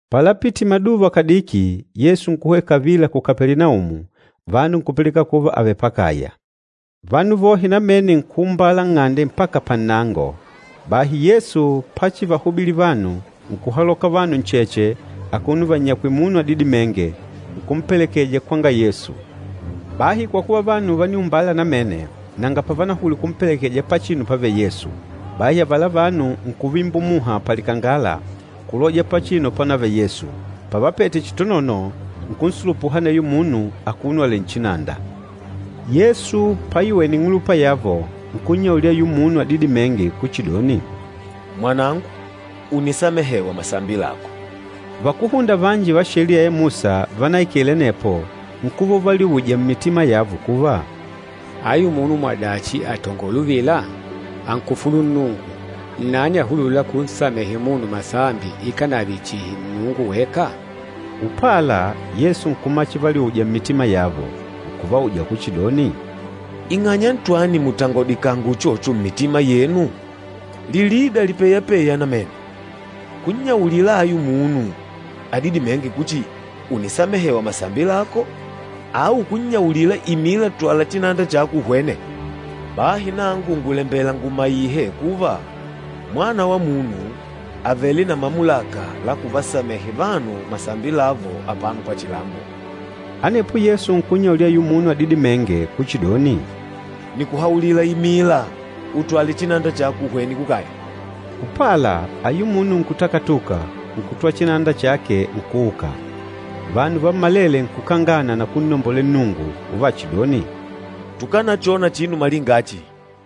Palapitile maduva kadiki, Yesu nkuhwena kavila ku Kapelinaumu, vanu nkupilikana kuva àvele pakaya. Vanu vohe namene nkuumbala nng'ande mpaka pannango. Bahi Yesu pachivahubilila vanu, nkuhaloka vanu ncheche akuno vannyakwìlè munu adidimênge, nkumpelekeja kwanga Yesu. Bahi kwa kuva vanu vániumbala namene, nanga pavanahulwile kumpelekeja pachinu pávèlè Yesu. Bahi avala vanu nkuvimbula muha palikangala, kuloja pachinu pánavele Yesu. Pavapete chitonono, nkunsulupuha aneyo munu akuno alèlè nchinanda. Yesu paiwene ing'ulupa yavo, nkunnyaulila ayula munu adidimênge kuchidoni, “Mwanangu, ùnisamehewa masambi lako.” Vakúhunda vanji va Sheliya ya Musa vanaikele anepo nkuva uvaliuja mmitima yavo kuva, “Ayu munu mwadachi àtangola uvila? Ànkufulu Nnungu! Nnani ahulûla kunsamehe munu masambi ikànave chihi Nnungu weka?” Upala, Yesu nkumala chivaliuja mmitima yavo, nkuvauja kuchidoni, “Ing'anya ntwani mùtangodikanga uchocho mmitima yenu? Lilida lipeyapêya namene, kunnyaulila ayu munu adidimênge kuchi, ‘Ùnisamehewa masambi lako,’ au kunnyaulila, ‘Imila, twala chinanda chako uhwene?’ Bahi nangu ngùlembela ngumaihe kuva, Mwana wa Munu, àvele na mamulaka la kuvasamehe vanu masambi lavo apano pachilambo.” Anepo Yesu nkunnyaulila ayula munu adidimênge kuchidoni, “Nìkuhaulila, imila, utwale chinanda chako uhwene kukaya!” Upala, ayula munu nkutakatuka, nkutwala chinanda chake, nkuuka. Vanu vammalele nkukangana na kunnombolela Nnungu uvachidoni, “Tukanachona chinu malinga achi.”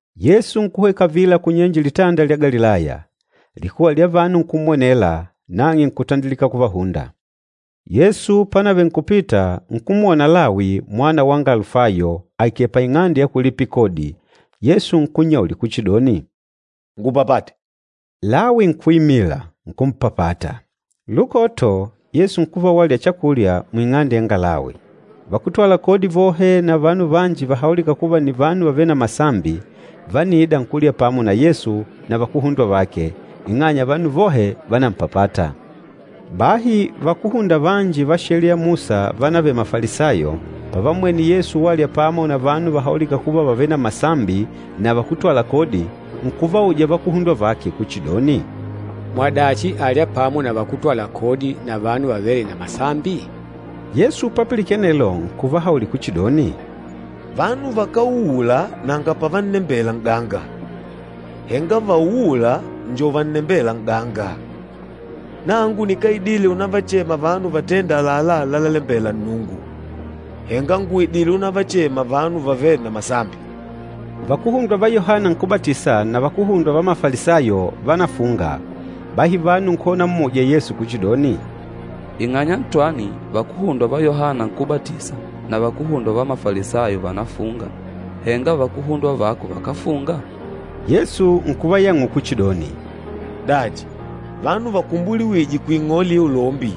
Yesu nkuhwena kavila kunyenje Litanda lya Galilaya. Likuwa lya vanu nkummwenela, nang'e nkutandilika kuvahunda. Yesu pánavele nkupita, nkumwona Lawi mwana wanga Alufayo, aikèlè paing'ande ya kulipila kodi. Yesu nkunnyaulila kuchidoni, “Ngupapate!” Lawi nkuimila, nkumpapata. Lukoto, Yesu nkuva walya chakulya muing'ande yanga Lawi. Vakútwala kodi vohe na vanu vanji vahaulîka kuva nni vanu vavêle na masambi, vániida nkulya pamo na Yesu na vakuhundwa vake, ing'anya vanu vohe vánampapata. Bahi vakúhunda vanji va Sheliya ya Musa vánavele Mafalisayo, pavammwene Yesu walya pamo na vanu vahaulîka kuva vàvele na masambi na vakútwala kodi, nkuvauja vakuhundwa vake kuchidoni, “Mwadachi àlya pamo na vakútwala kodi na vanu vavêle na masambi?” Yesu papilikene anelo nkuvahaulila kuchidoni, “Vanu vakáuula nanga pavannembela n'ganga, henga vauûla njo vannembêla n'ganga. Nangu nikáidile unavachema vanu vatênda àlalá lalalembela Nnungu, henga ngùidile unavachema vanu vavêle na masambi.” Vakuhundwa va Yohana Nkúbatisa na vakuhundwa va Mafalisayo vánafunga. Bahi vanu nkuhwena unammuja Yesu kuchidoni, “Ing'anya ntwani vakuhundwa va Yohana Nkúbatisa na vakuhundwa va Mafalisayo vànafunga, henga vakuhundwa vako vakáfunga?” Yesu nkuvayang'ula kuchidoni, “Dachi, vanu vakumbuliwîje kuing'ole ya ulombi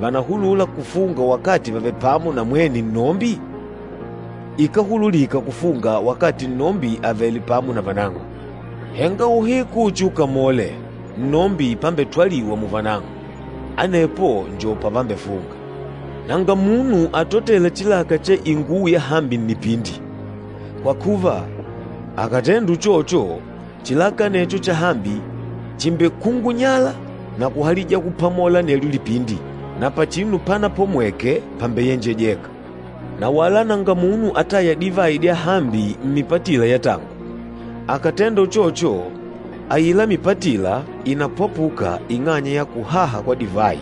vànahulula kufunga wakati vàvele pamo na mwene nnombi? Ikáhululika kufunga wakati nnombi àvele pamo na vanang'o. Henga uhiku uchiukamole, nnombi pambetwaliwa muvanang'o, anepo njo pavambefunga. Nanga munu atotêla chilaka cha inguwo yahambi nnipindi. Kwa kuva, akàtenda uchocho, chilaka anecho chahambi chìmbekungunyala na kuhalija kupamola anelyo lipindi, na pachinu panapomweke pambeyenjejeka. Na wala nanga munu atâya divayi dyahambi mmipatila ya tangu. Akàtenda uchocho, aila mipatila ìnapwapuka ing'anya ya kuhaha kwa divayi,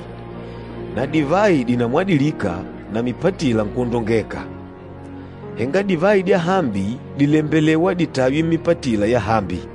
na divayi dìnamwadilika na mipatila nkwondongeka. Henga divayi dyahambi dìlembelewa ditaywe mmipatila yahambi!”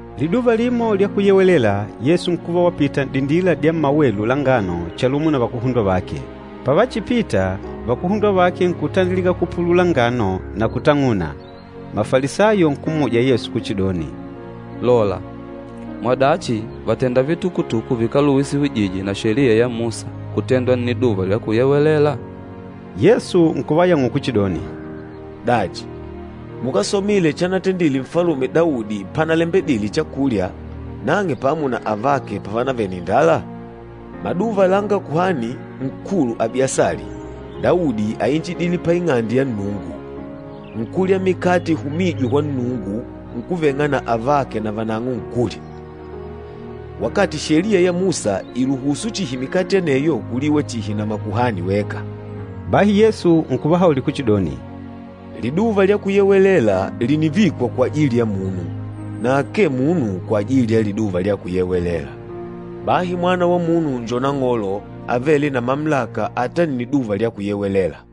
Liduva limo lya Kuyewelela, Yesu nkuva wapita n'dindila dya mmawelu la ngano chalumo na vakuhundwa vake. Pavachipita, vakuhundwa vake nkutandilika kupulula ngano na kutang'una. Mafalisayo nkummuja Yesu kuchidoni, “Lola! Mwadachi vàtenda vitukutuku vikáluhusiwije na Sheliya ya Musa kutendwa Nniduva lya Kuyewelela?” Yesu nkuvayang'ula kuchidoni, “Dachi, mukásomile chanatendite Nfalume Daudi panalembedile chakulya, nang'e pamo na avake pavanavele na indala?” Maduva langa Kuhani Nkulu Abiasali, Daudi áinjidile pa Ing'ande ya Nnungu, nkulya mikate ihumîjwe kwa Nnungu, nkuveng'a na avake navanang'o nkulya, wakati Sheliya ya Musa ìluhusu chihi mikate aneyo kuliwa chihi na makuhani weka. Bahi Yesu nkuvahaulila kuchidoni, “Liduva lya Kuyewelela lìnivikwa kwajili ya munu, na akee munu kwajili ya Liduva lya Kuyewelela. Bahi Mwana wa Munu njo Nang'olo avêle na mamulaka ata Nniduva lya Kuyewelela.”